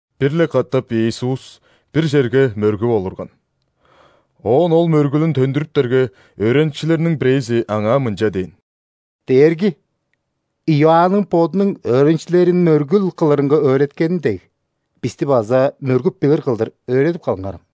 Бир-ле катап Иисус бир черге мөргүп олурган. Оон Ол мөргүлүн төндүрүптерге, өөреникчилериниң бирээзи Аңаа мынча дээн: «Дээрги! Иоанның бодунуң өөреникчилерин мөргүл кылырынга өөреткени дег, бисти база мөргүп билир кылдыр өөредип калыңарам».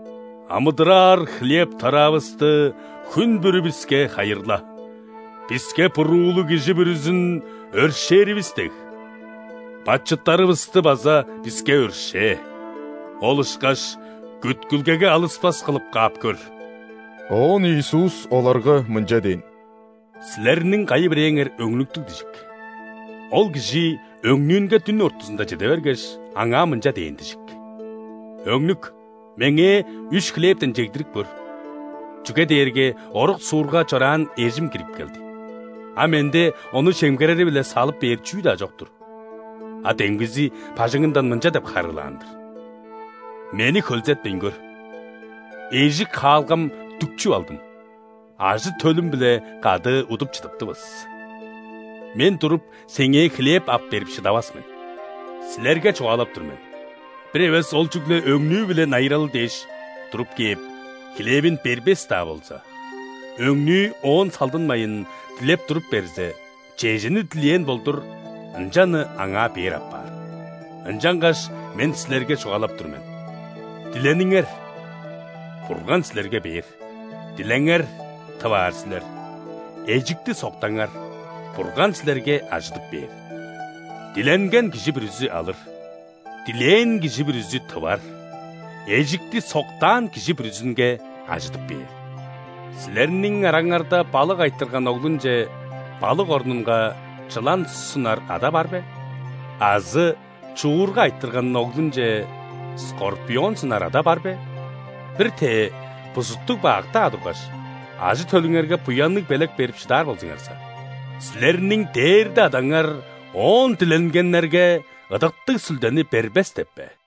Амыдыраар хлеб-тараавыстыхүн бүрү биске хайырла. Биске буруулуг кижи бүрүзүн өршээривис дег,бачыттарывысты база биске өршээ!Ол ышкаш күткүлгеге алыспас кылып каап көр». Оон Иисус оларга мынча дээн: «Силерниң кайы-бирээңер өңнүктүг дижик. Ол кижи өңнүүнге дүн ортузунда чеде бергеш, аңаа мынча дээн дижик: „Өңнүк! Меңээ үш хлебтен чегдирип көр, чүге дээрге орук-суурга чораан эжим кирип келди, а менде ону чемгерери-биле салып бээр чүү-даа чок-тур“. А демгизи бажыңындан мынча деп харыылаан-дыр: „Мени хөлзетпейн көр, эжик-хаалгам дүкчүп алдым, ажы-төлүм-биле кады удуп чыдыптывыс. Мен туруп, сеңээ хлеб ап берип шыдавас мен“. Силерге чугаалап тур мен: бир эвес ол чүгле өңнүү-биле найыралы дээш, туруп кээп, хлевин бербес-даа болза, өңнүү оон салдынмайн, дилеп туруп берзе, чежени дилээн болдур, ынчаны аңаа бээр апаар. Ынчангаш Мен силерге чугаалап тур мен: дилениңер – Бурган силерге бээр; дилеңер – тып аар силер; эжикти соктаңар – Бурган силерге ажыдып бээр. Диленген кижи бүрүзү алыр, дилээн кижи бүрүзү тывар, эжикти соктаан кижи бүрүзүнге ажыдып бээр. Силерниң араңарда балык айтырган оглунче балык орнунга чылан сунар ада бар бе? Азы чуурга айтырган оглунче скорпион сунар ада бар бе? Бир-тээ, бузуттуг-бак-даа тургаш, ажы-төлүңерге буянныг белек берип шыдаар болзуңарза, силерниң дээрде Адаңар Оон диленгеннерге Ыдыктыг Сүлдени бербес деп бе?»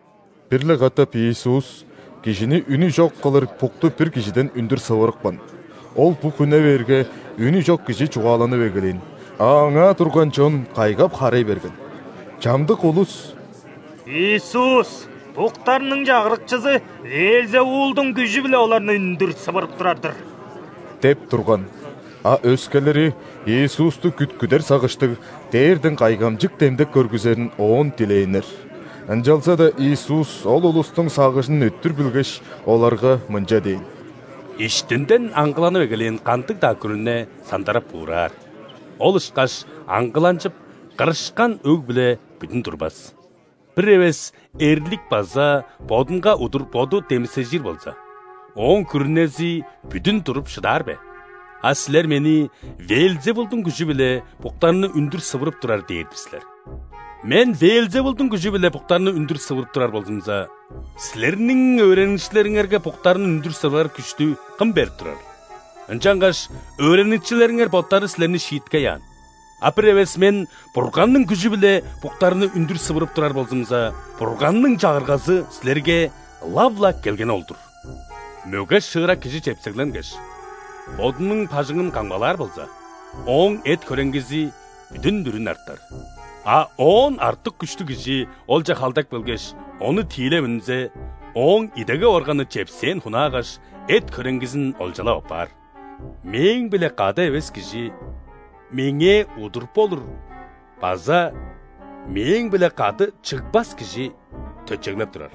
Бир-ле катап Иисус кижини үнү чок кылыр букту бир кижиден үндүр сывырыпкан. Ол бук үне бээрге, үнү чок кижи чугааланып эгелээн, а аңаа турган чон кайгап-харай берген. Чамдык улус: «Иисус буктарның чагырыкчызы ·Веелзевулдуң күжү-биле оларны үндүр сывырып турар-дыр» – деп турган. А өскелери, Иисусту күткүдер сагыштыг, дээрден кайгамчык демдек көргүзерин Оон дилээннер. Ынчалза-даа Иисус ол улустуң сагыжын өттүр билгеш, оларга мынча дээн: «Иштинден аңгыланып эгелээн кандыг-даа күрүне сандарап-буураар, ол ышкаш аңгыланчып, кырышкан өг-бүле бүдүн турбас. Бир эвес эрлик база бодунга удур боду демисежир болза, ооң күрүнези бүдүн туруп шыдаар бе? А силер Мени ·Веелзевулдуң күжү-биле буктарны үндүр сывырып турар дээр-дир силер. Мен Веелзевулдуң күжү-биле буктарны үндүр сывырып турар болзумза, силерниң өөреникчилериңерге буктарны үндүр сывырар күштү кым берип турарыл? Ынчангаш өөреникчилериңер боттары силерни шииткей аан. А бир эвес Мен Бурганның күжү-биле буктарны үндүр сывырып турар болзумза, Бурганның Чагыргазы силерге ылап-ла келгени ол-дур. Мөге-шыырак кижи чепсегленгеш, бодунуң бажыңын камгалаар болза, ооң эт-хөреңгизи бүдүн-бүрүн артар. А оон артык күштүг кижи олче халдап келгеш, ону тиилеп үнзе, ооң идегеп органы чепсээн хунаагаш, эт-хөреңгизин олчалап аппаар. Мээң-биле кады эвес кижи Меңээ удур болур база Мээң-биле кады чыгбас кижи төтчеглеп турар.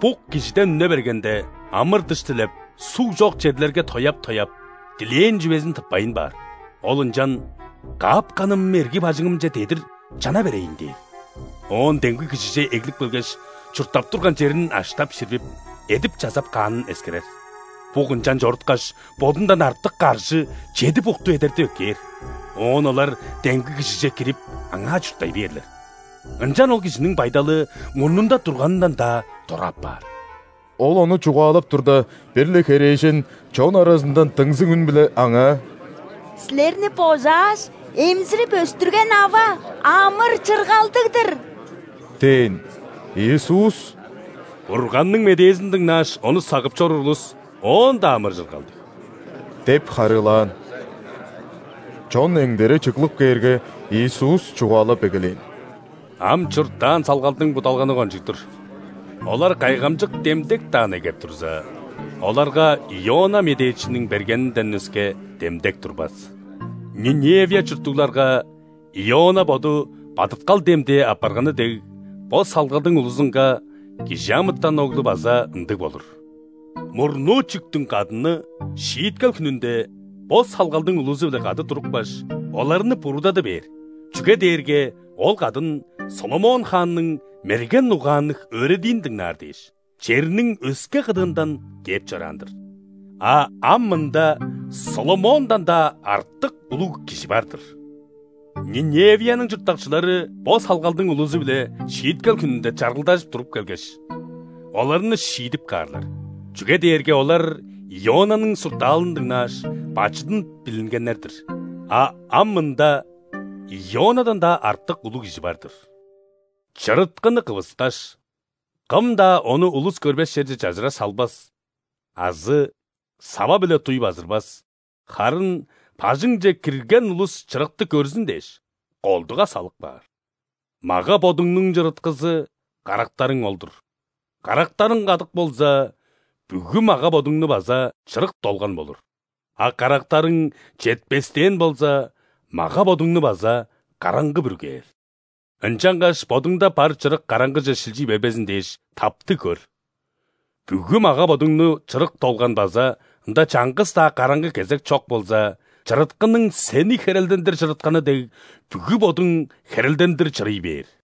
Бук кижиден үне бергенде, амыр-дыш дилеп, суг чок черлерге тояап-тояап, дилээн чүвезин тыппайн баар. Ол ынчан: „Каапканым эрги бажыңымче дедир чана берейн“ – дээр. Оон демги кижиже эглип келгеш, чурттап турган черин аштап-ширбип, эдип-чазап каанын эскерер. Бук ынчан чоруткаш, бодундан артык каржы чеди букту эдертип эккээр, оон олар демги кижиже кирип, аңаа чурттай бээрлер. Ынчан ол кижиниң байдалы мурнунда турганындан-даа дора апаар». Ол ону чугаалап турда, бир-ле херээжен чон аразындан дыңзыг үн-биле Аңаа: «Силерни божааш, эмзирип өстүрген ава амыр-чыргалдыг-дыр!» – дээн. Иисус: «Бурганның медээзин дыңнааш, ону сагып чоруур улус оон-даа амыр-чыргалдыг!» – деп харыылаан. Чон эңдере чыглып кээрге, Иисус чугаалап эгелээн: «Ам чурттаан салгалдың будалганы кончуг-дур. Олар кайгамчык демдек-даа негеп турза, оларга Иона медээчиниң бергенинден өске демдек турбас. Ниневия чурттугларга Иона боду бадыткал демдээ апарганы дег, бо салгалдың улузунга ·Кижи амытан Оглу база ындыг болур. Мурнуу чүктүң кадыны Шииткел хүнүнде бо салгалдың улузу-биле кады турупкаш, оларны буруудады бээр, чүге дээрге ол кадын ·Соломон хаанның мерген угаанныг өөредиин дыңнаар дээш, черниң өске кыдыындан кээп чораан-дыр. А ам мында Соломондан-даа артык улуг Кижи бар-дыр. Ниневияның чурттакчылары бо салгалдың улузу-биле шииткел хүнүнде чаргылдажып туруп келгеш, оларны шиидип каарлар, чүге дээрге олар Ионаның суртаалын дыңнааш, бачыдын билингеннер-дир, а ам мында Ионадан-даа артык улуг Кижи бар-дыр». «Чырыткыны кывыскаш, кым-даа ону улус көрбес черже чажыра салбас азы сава-биле дуй базырбас, харын бажыңче кирген улус чырыкты көрзүн дээш, колдуга салып каар. Мага-бодуңнуң чырыткызы – карактарың ол-дур. Карактарың кадык болза, бүгү мага-бодуңну база чырык долган болур; а карактарың четпестээн болза, мага-бодуңну база караңгы бүргээр. Ынчангаш бодуңда бар чырык караңгыже шилчий бербезин дээш, таптыг көр. Бүгү мага-бодуңну чырык долган база ында чаңгыс-даа караңгы кезек чок болза, чырыткының сени херелдендир чырытканы дег, бүгү бодуң херелдендир чырый бээр».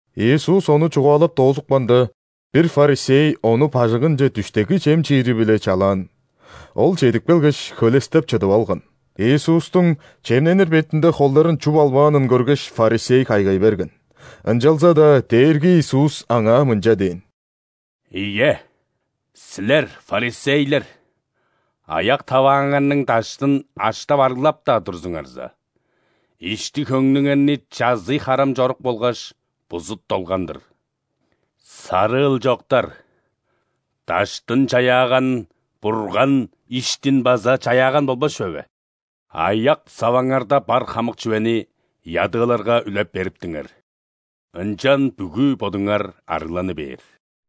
Иисус ону чугаалап доозупканда, бир ·фарисей Ону бажыңынче дүштеки чем чиири-биле чалаан. Ол чедип келгеш, хөлестеп чыдып алган. Иисустуң чемненир бетинде холдарын чуп албаанын көргеш, фарисей кайгай берген. Ынчалза-даа Дээрги Иисус аңаа мынча дээн: «Ийе, силер, фарисейлер, аяк-тавааңарның даштын аштап-арыглап-даа турзуңарза, ишти-хөңнүңерни чазый-харам чорук болгаш бузут долган-дыр. Сарыыл чоктар! Даштын чаяаган Бурган иштин база чаяаган болбас чүве бе? Аяк-саваңарда бар хамык чүвени ядыыларга үлеп бериптиңер, ынчан бүгү бодуңар ·арыгланы бээр.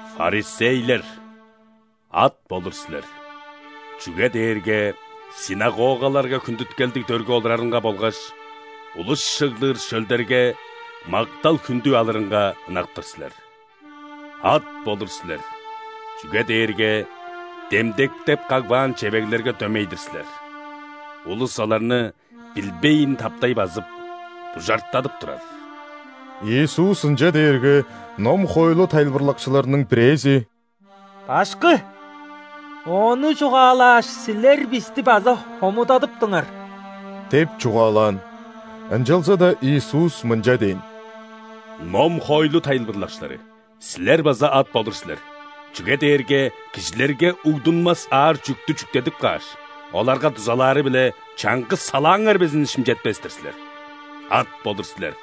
Фарисейлер, ат болур силер, чүге дээрге ·синагогаларга хүндүткелдиг дөрге олурарынга болгаш улус чыглыр шөлдерге мактал-хүндү алырынга ынак-тыр силер. Ат болур силер, чүге дээрге демдектеп кагбаан чевеглерге дөмей-дир силер – улус оларны билбейн таптай базып, бужартадып турар». Иисус ынча дээрге, ном-хоойлу тайылбырлакчыларының бирээзи: «Башкы! Ону чугаалааш, Силер бисти база хомудадыптыңар» – деп чугаалаан. Ынчалза-даа Иисус мынча дээн: «Ном-хоойлу тайылбырлакчылары, силер база ат болур силер, чүге дээрге кижилерге угдунмас аар чүъктү чүктедип кааш, оларга дузалаары-биле чаңгыс салааңар безин шимчетпес-тир силер. Ат болур силер: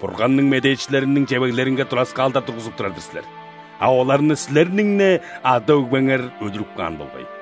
Бурганның медээчилериниң чевеглеринге тураскаалдар тургузуп турар-дыр силер, а оларны силерниң-не ада-өгбеңер өлүрүп каан болгай.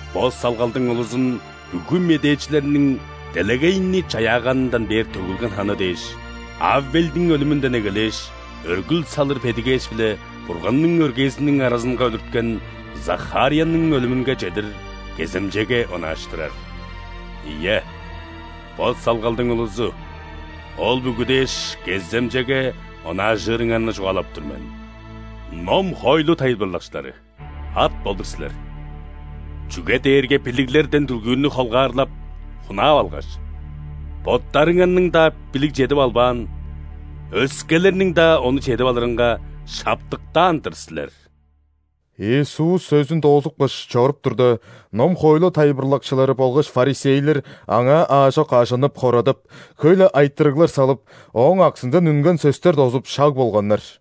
Бо салгалдың улузун бүгү медээчилерниң делегейни чаяаганындан бээр төгүлген ханы дээш: Авелдиң өлүмүнден эгелээш, өргүл салыр бедигээш биле Бурганның өргээзиниң аразынга өлүрткен Захарияның өлүмүнге чедир – кеземчеге онааштырар. Ийе, бо салгалдың улузу, ол бүгү дээш кеземчеге онаажырыңарны чугаалап тур мен. Ном-хоойлу тайылбырлакчылары, ат болур силер, чүге дээрге билиглерден дүлгүүрнү холгаарлап, хунаап алгаш, боттарыңар-даа билиг чедип албаан, өскелерниң-даа ону чедип алырынга шаптыктаан-дыр силер». Иисус сөзүн доозупкаш, чоруп турда, ном-хоойлу тайылбырлакчылары болгаш ·фарисейлер Аңаа аажок ажынып-хорадап, хөй-ле айтырыглар салып, Ооң аксындан үнген сөстер дозуп шаг болганнар.